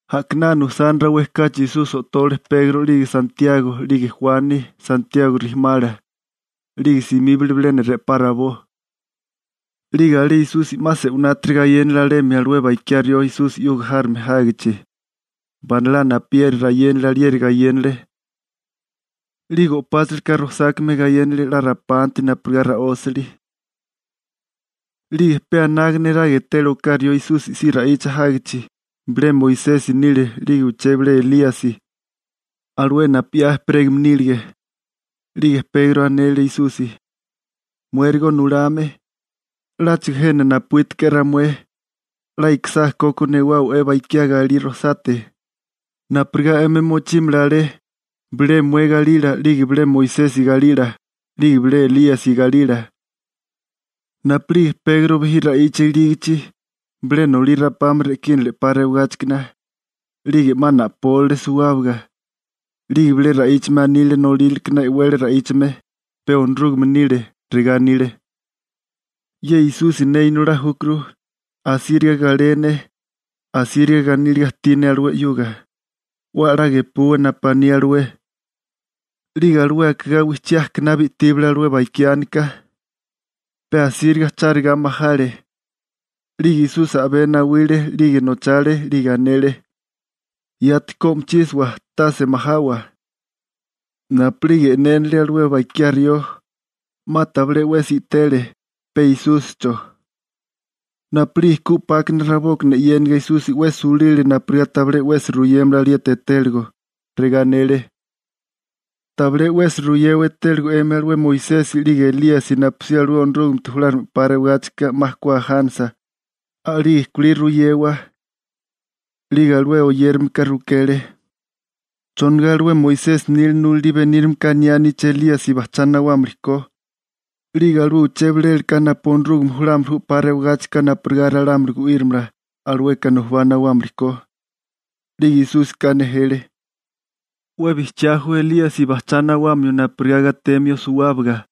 A'kinana usani rawé kachi Esusi o'tole Pegro 'lige Santiago, 'lige Juani, Santiago bonila, 'lige simíbale bilena re'pá rabó. 'Lige alé Esusi 'ma se'winátiri gayénale alemi alué bakiá rió Esusi 'yuga járome jágichi. Banalá napuyeri rayénali alieri gayénale. 'Lige o'páchalaka rojsákame gayénale 'la rapanti napurigá ra'ósali. 'Lige pe anaga neraga etele oká rió Esusi si ra'icha jágichi, bilé Moisesi nile 'lige uché bilé Elíasi, alué napu 'ya ejperégame nílige. 'Lige Pegro anele Esusi: ―Muérigo nulame, ¡'láchigo jena napuítiko'é ramué! 'La ikisá koko newáwa'é bakiá galí rojsate, napurigá 'emi mochímala alé, bilé mué galila 'lige bilé Moisesi galila, 'lige bilé Elíasi galila. Napu'lige Pegro bijí ra'icha ilígichi, bilé nolí rapame re'kínale 'pa rewigáchikana, 'lige 'ma na'pólale suwábaga. 'Lige bilé ra'íchame anile nolíralekana e'wele ra'íchame, pe Onorúgame nile, regá anile: ―Ye Esusi ne Inolá júkuru, asíriga galé ne. Asíriga ganíliga ajtí ne alué 'yuga. 'We a'lá gepuwa napu aní alué. 'Lige alué akigá wijchí ajkaná bi'tíbale alué bakiánika, pe asíriga charigá majale. 'Lige Esusi a'bé nawile 'lige nochale 'lige anele: ―Yati ku o'michísawa, tase majawa. Napu'lige e'nénale alué bakiá rió, 'ma tabilé 'wesi i'tele, pe Esúsicho. Napu'lige ku 'pákana rabókana e'yéniga Esusi 'we sulile napurigá tabilé 'wesi ruyémala alieti etéligo. Regá anele: ―Tabilé 'wesi ruyewa etéligo 'emi alué Moisesi 'lige Elíasi napusí alué Onorúgamete julárigame 'pa rewagáchika 'ma ku ajánisa, a'lige kulí ruyewa. 'Lige alué oyérameka rukele: ―¿Chonigá alué Moisesi nila nulalí benírimeka aniáníché Elíasi bajchá nawámili ko 'lige alué uché bilélaka napu Onorúgame julámili ju 'pa rewigáchika napurigá ralámuli gu'írimala, alueka nujubá nawámili ko? 'Lige Esúsika nejele: ―'We bijchiá ju Elíasi bajchá nawamio napurigá gatemio suwábaga.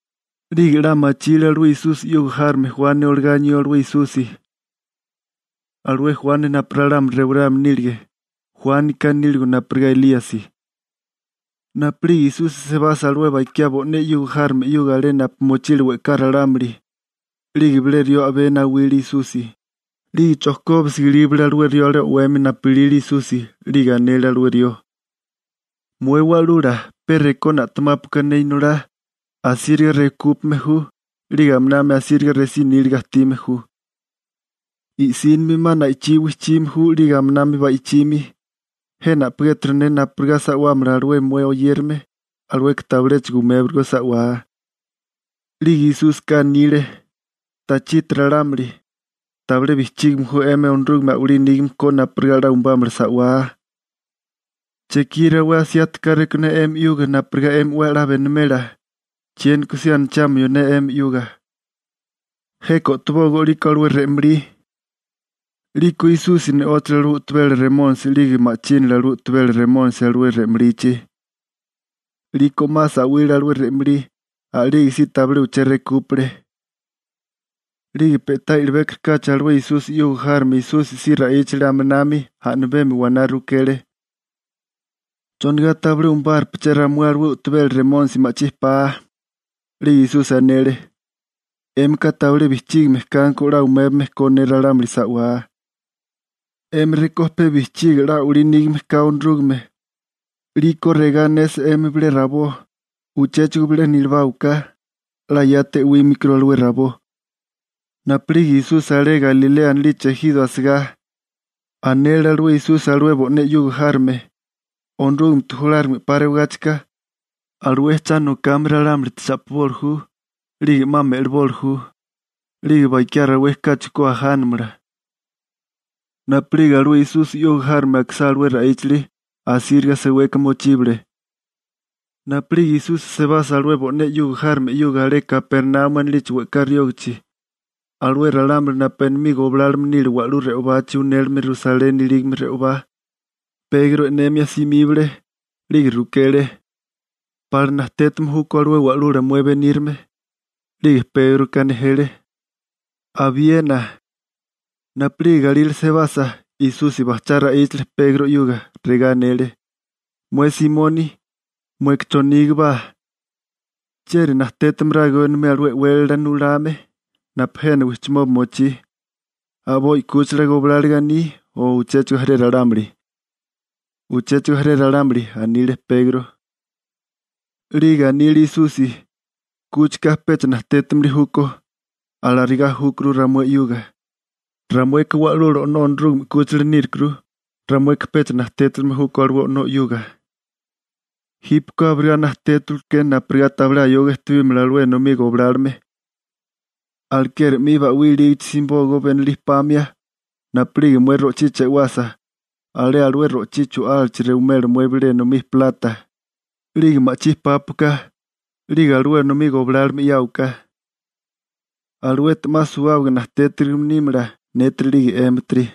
'Lige 'la machile alué Esusi 'yuga járome Juani olagá anió alué Esusi, alué Juani napu ralámuli rewarame nílige, Juánika níligo napurigá Elíasi. Napu'lige Esusi sebasa alué bakiá bo'né 'yuga járome 'yuga alé napu mochile we'ká ralámuli, 'lige bilé rió a'bé nawile Esusi, 'lige chojkóbisiga ilíbale alué rió alé o'wemi napu ilile Esusi, 'lige anele alué rió: ―Mué Wa'lula, pe rekó na'temápuaka ne inolá. Asíriga rekúpame ju, 'lige aminami asíriga resí níliga ajtime ju. I'sínimi 'ma na'ichí wijchime ju 'lige aminami ba'ichimi. Jena a'pigéturu ne napurigá sa'wámala alué mué oyérame, alueka tabiléchigo umébatigó sa'wá. 'Lige Esúsika anile: ―¡Tachiti ralámuli! ¿Tabilé bijchígime ju 'emi Onorúgame a'walí nígame ko napurigá 'la umbámala sa'wá? ¿Chekí rawé asiati káréko ne 'emi 'yuga napurigá 'emi 'we a'lá benimela? ¿Chiéniko si anachamio ne 'emi 'yuga? Jeka o'tobógó 'liko alué re'malí. 'Liko Esusi ne'óchale alué u'tabela remónisi 'lige ma'chínale alué u'tabela remónisi alué re'malichi, 'liko 'ma sa'wile alué re'malí, a'lige si tabilé uché rekúpale. 'Lige pe'tá i'libékorikáchi alué Esusi 'yuga járome Esusi si ra'íchale aminami, a'mibemi waná rukele: ―¿Chonigá tabilé umabárupeché ramué alué u'tabela remónisi ma'chí pa? 'Lige Esusi anele: ―'Émika tabilé bijchígame kanko 'la umébame ko ne ralámuli sa'wá. 'Emi rekó pe bijchígie 'la a'walí nígame ka Onorúgame, 'liko regá anesa 'emi bilé rabó: «Uchéchigo bilena ilibáwaká», 'la yati e'wámikuru alué rabó. Napu'lige Esusi alé Galilea anilichi ejiro asigá, anele alué Esusi alué bo'né 'yuga járome: ―Onorúgamete julárigame 'pa rewagáchika, alué cha nokame ralámulite cha'piboli ju. 'Lige 'ma me'liboli ju. 'Lige bakiá rawé kachi ku ajánamala. Napu'lige alué Esusi 'yuga járome akisá alué ra'íchali, asíriga seweka mochíbale. Napu'lige Esusi sebasa alué bo'né 'yuga járome 'yuga alé Kapernaumi anilichi we'ká riógichi, alué ralámuli napu enomí goblálome nile wa'lú re'obachi unélime Rusaleni ilígame re'obá, Pegro e'nemia simíbale, 'lige rukele: ―¿Pala najtétame júkó alué wa'lula mué benírame? 'Lige Pégroka nejele: ―Abiena. Napu'lige galírale sebasa, Esusi bajchá ra'íchale Pegro 'yuga, regá anele: ―Mué Simoni, ¿mueka chonígobá? ¿Chieri najtétamarágo enomí alué e'wélala nulame, napu jena wijchimoba mochí, a'boi 'kúchila gobláliga aní o uchéchigo jaré ralámuli? ―Uchéchigo jaré ralámuli ―anile Pegro. 'Lige anile Esusi: ―Kúchika pecha najtétimili júkó. Alarigá júkuru ramué 'yuga, ramueka Wa'lula O'nó Onorúgame 'kúchila nírukuru, ramueka pecha najtétilime júkó alué o'nó 'yuga. Jípeko abirigá najtétawaleké napurigá tabilé ayoga ejtebímala alué enomí goblálome. Alekeri 'mi ba'wí ilígichi simibógó benolí pamia, napu'lige mué ro'chí chewasa, alé alué ro'chí chu'álachi rewimela mué bilé enomí plata, 'lige ma'chí pápuaká, 'lige alué enomí goblálome 'yáwaká. Aluete 'ma suwábaga najtétarigime nímala, nétiri 'lige 'émitiri.